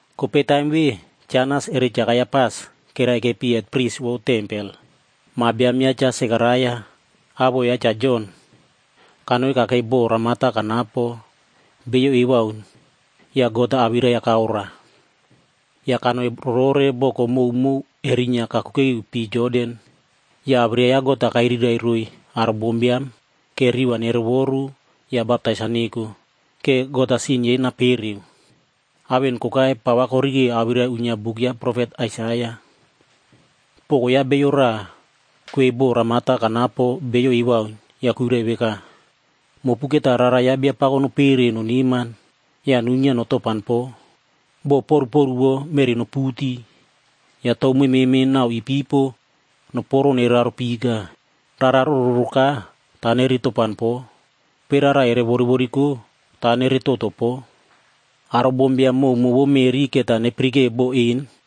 Kopei taim ve, Cha Anas eri Cha Kaiapas keraikepi hetprisb vou tempel. Ma biam yaꞌa Cha Sekaraia awoꞌo yaꞌa Cha Jon, kanoi kakei bo ramata kanapo beiyo ewaun ya God-a awirai-ya kaoroa. Ya kanoi rorore boko mowmow kerinyia kakuke iu pii Jordan. Ya awirai ya God-a kairirai roiy aro bombiam, ke riꞌi va nerovoru ya baptais-a neko, ke God-a sin yei naririkeoki. Ao en kokai pa va korikeo awirai uinyia buk ya profet Aisaia. “Poko ya bio raꞌa kwei bo ramata kanapo beiyo ewaun ya kuirai veka, ‘Mopu keta rara ya Biapako nopere noneman ya nuinyia notopan po. Bo poruporuwo meꞌri noputi ya tou mememe nau ipipo, noporo nereraro pika. Rara rororoka ta neretopan po, kopei rara ere woriworiko ta neretoto po. Aro bombiam mowmow vou meꞌri keta nepirikeo bo en,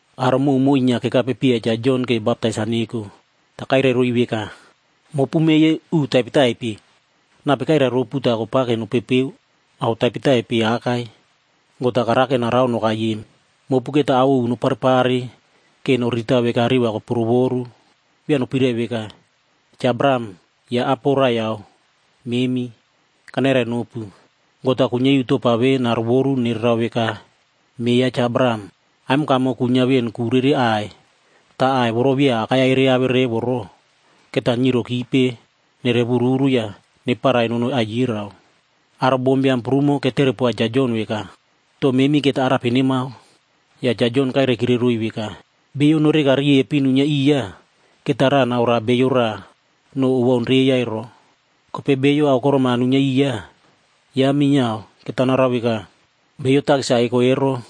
Aro mowmow inyia kekapepiya Cha Jon ke baptais-a neko, ta kairai roiy veka, “Mopu meꞌe yei uꞌu taipetaipe, nape kairai ropu ta kopake nopepeo ao taipetaipe akai, God-a karake narao nokai em? Mopu keta ao ovu noparepare ke noriritao veka riꞌi va kopurovoru. Via nopirai veka, ‘Cha Abraham yaꞌa apo raiyau memi.’ Kanairai nopu, God-a kuinyia iu topa ve narovoru nererao veka meꞌe ya Cha Abraham. Aimonkamo kuinyia ven ku rere aꞌai. Ta aꞌai voro via akai-ya ereave revo ero, keta nyirokipe nereworuru ya neparai nonoi aiyerao.” Aro bombiam prumo ketere poa Cha Jon veka, “To memi keta arape nemao?” Ya Cha Jon kairaikire roiy veka, “Bio noreka riepin nuinyia iya, keta raꞌa naoroa bio raꞌa no owaun reiya ero. Kopei bio aokorom-a nuinyia iya, yaꞌa minyiao keta narao veka.” Beiyo takis-a eko ero,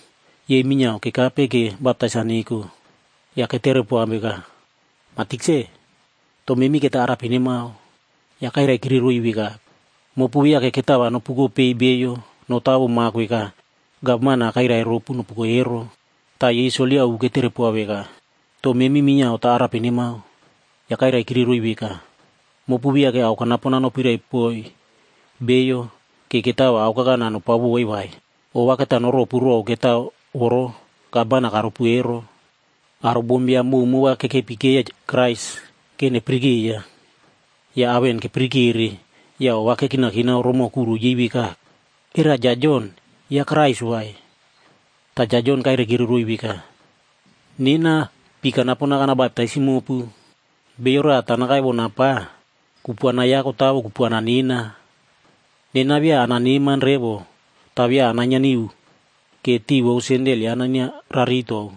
yei minyiao kekape ke baptais-a neko. Ya ketere poa veka, “Ma Tikse, to memi keta arape nemao?” Ya kairaikire roiy veka, “Mopu viake ketao va nopukopei beiyo notawo mak veka gavman-a kairai ropu nopuko ero.” Ta yei soldia ovu ketere poa veka, “To memi minyiao ta arape nemao?” Ya kairaikire roiy veka, “Mopu viake ao kanapon-a nopirai poiy beiyo ke ketao va aokakana nopao voiy vai. Ova keta noropu row ketao voro gavman-a karopu ero.” Aro bombiam mowmow va kekepikeiya Krais ke nepirikeiya. Ya ao en kepirikere ya ova kekinakinao romoꞌo kuro yei veka, “Era Cha Jon, yaꞌa Kraisd vai?” Ta Cha Jon kairaikire roiy veka, “Nena pii kanapon-a kanabaptaisim mopu, bio raꞌa ta nakaiwona pa. Kupuana yaꞌa kotawo kupuana nena. Nena via ananeman revo ta via anainyia niu ke tiꞌi vou sendel yaꞌa nenia raritou.e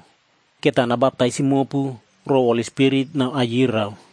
Keta nabaptaisim mopu row Holi Spirit nau aiyerao.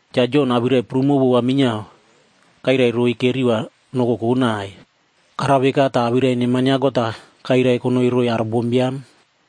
Cha Jon awirai prumo vova minyiao kairai roiy ke riꞌi va nokokonai. Karao veka ta awirai neman ya God-a kairai konoi roiy aro bombiam.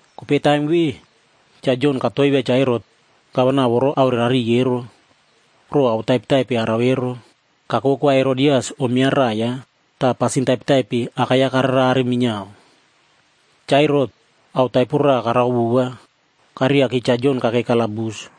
Kopei taim ve, Cha Jon katoivia Cha Herot gavana voro aorerariy ero, row ao taipetaipe arao ero. Kako vou Kwa Herodias om ya raꞌai yaꞌa. Ta pasin taipetaipe akai-ya kararerare minyiao. Cha Herot ao taipo raꞌa karao vova, kareriaki Cha Jon kakei kalabus.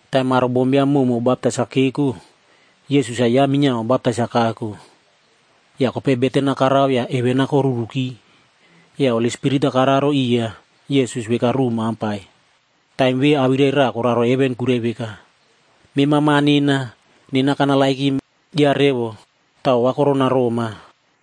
Taim aro bombiam mowmow baptais-a keko, Yesus-a ya minyiao baptais-a kako. Ya kopei beten-a karao ya heven-a koruriki. Ya Holi Spirit-a kararo iya Yesus veka ruꞌu mampai. Taim ve awirai raꞌa koraro heven kuirai veka, “Mema Ma nena. Nena kanerenoma revo ta ova koronaroma.”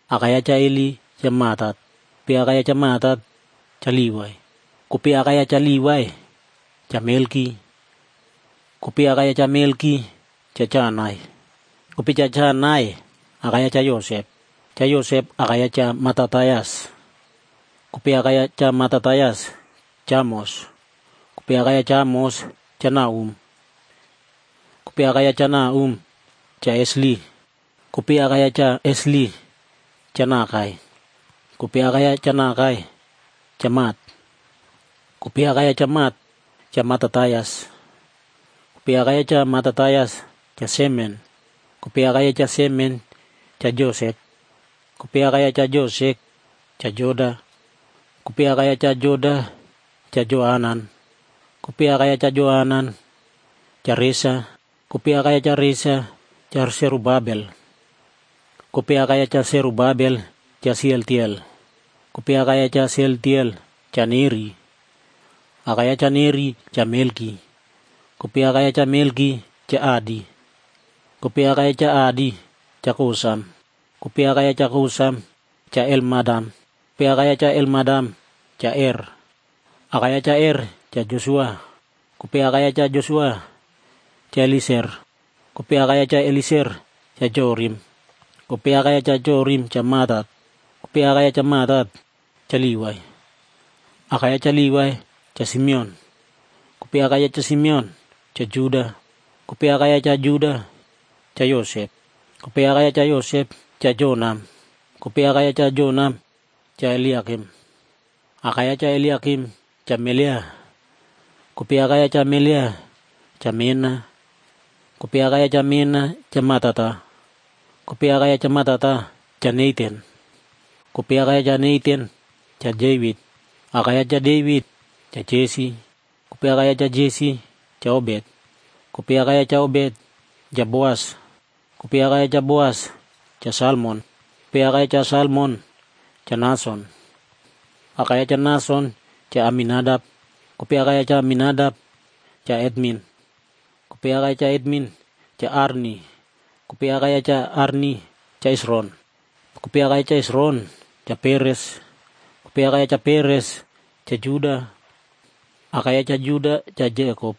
Aka ya Cha Heli, Cha Matat. Kopei aka ya Cha Matat, Cha Livai. Kopei aka ya Cha Livai, Cha Melki. Kopei aka ya Cha Melki, Cha Janai. Kopei Cha Janai, aka ya Cha Yosep. Cha Yosep aka ya Cha Matatias. Kopei aka ya Cha Matatias, Cha Amos. Kopei aka ya Cha Amos, Cha Nahum. Kopei aka ya Cha Nahum, Cha Esli. Kopei aka ya Cha Esli, Cha Nagai. Kopei aka ya Cha Nagai, Cha Mat. Kopei aka ya Cha Mat, Cha Matatias. Kopei aka ya Cha Matatias, Cha Semen. Kopei aka ya Cha Semen, Cha Josek. Kopei aka ya Cha Josek, Cha Joda. Kopei aka ya Cha Joda, Cha Joanan. Kopei aka ya Cha Joanan, Cha Resa. Kopei aka ya Cha Resa, Cha Serubabel. Kopei aka ya Cha Serubabel, Cha Sealtiel. Kopei aka ya Cha Sealtiel, Cha Neri. Aka ya Cha Neri, Cha Melki. Kopei aka ya Cha Melki, Cha Adi. Kopei aka ya Cha Adi, Cha Kosam. Kopei aka ya Cha Kosam, Cha Elmadam. Kopei aka ya Cha Elmadam, Cha Er. Aka ya Cha Er, Cha Josua. Kopei aka ya Cha Josua, Cha Elieser. Kopei aka ya Cha Elieser, Cha Jorim. Kopei aka ya Cha Jorim, Cha Matat. Kopei aka ya Cha Matat, Cha Livai. Aka ya Cha Livai, Cha Simeon. Kopei aka ya Cha Simeon, Cha Juda. Kopei aka ya Cha Juda, Cha Yosep. Kopei aka ya Cha Yosep, Cha Jonam. Kopei aka ya Cha Jonam, Cha Eliakim. Aka ya Cha Eliakim, Cha Melea. Kopei aka ya Cha Melea, Cha Mena. Kopei aka ya Cha Mena, Cha Matata. Kopei aka ya Cha Matata, Cha Natan. Kopei aka ya Cha Natan, Cha Devit. Aka ya Cha Devit, Cha Jesi. Kopei aka ya Cha Jesi, Cha Obet. Kopei aka ya Cha Obet, Cha Boas. Kopei aka ya Cha Boas, Cha Salmon. Kopei aka ya Cha Salmon, Cha Nason. Aka ya Cha Nason, Cha Aminadap. Kopei aka ya Cha Aminadap, Cha Atmin. Kopei aka ya Cha Atmin, Cha Arni. Kopei aka ya Cha Arni, Cha Hesron. Kopei aka ya Cha Hesron, Cha Peres. Kopei aka ya Cha Peres, Cha Juda. Aka ya Cha Juda, Cha Jekop.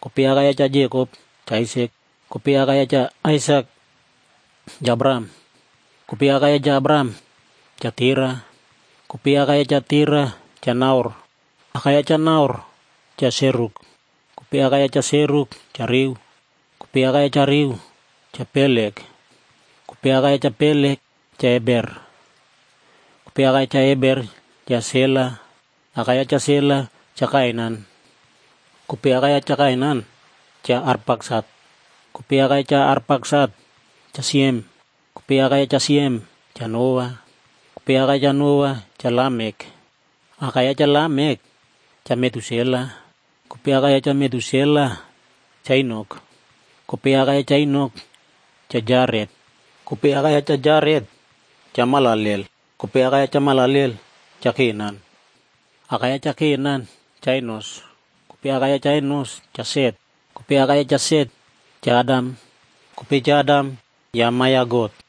Kopei aka ya Cha Jekop, Cha Aisak. Kopei aka ya Cha Aisak, Cha Abraham. Kopei aka ya Cha Abraham, Cha Tera. Kopei aka ya Cha Tera, Cha Nahor. Aka ya Cha Nahor, Cha Seruk. Kopei aka ya Cha Seruk, Cha Reu. Kopei aka ya Cha Reu, Cha Pelek. Kopei aka ya Cha Pelek, Cha Eber. Kopei aka ya Cha Eber, Cha Sela. Aka ya Cha Sela, Cha Kainan. Kopei aka ya Cha Kainan, Cha Arpaksat. Kopei aka ya Cha Arpaksat Cha Siem. Kopei aka ya Cha Siem, Cha Noa. Kopei aka ya Cha Noa, Cha Lamek. Aka ya Cha Lamek, Cha Metusela. Kopei aka ya Cha Metusela, Cha Enok. Kopei aka ya Cha Enok, Cha Jaret. Kopei aka ya Cha Jaret, Cha Mahalalel. Kopei aka ya Cha Mahalalel, Cha Kenan. Aka ya Cha Kenan, Cha Enos. Kopei aka ya Cha Enos, Cha Set. Kopei aka ya Cha Set, Cha Adam. Kopei Cha Adam ya ma ya God.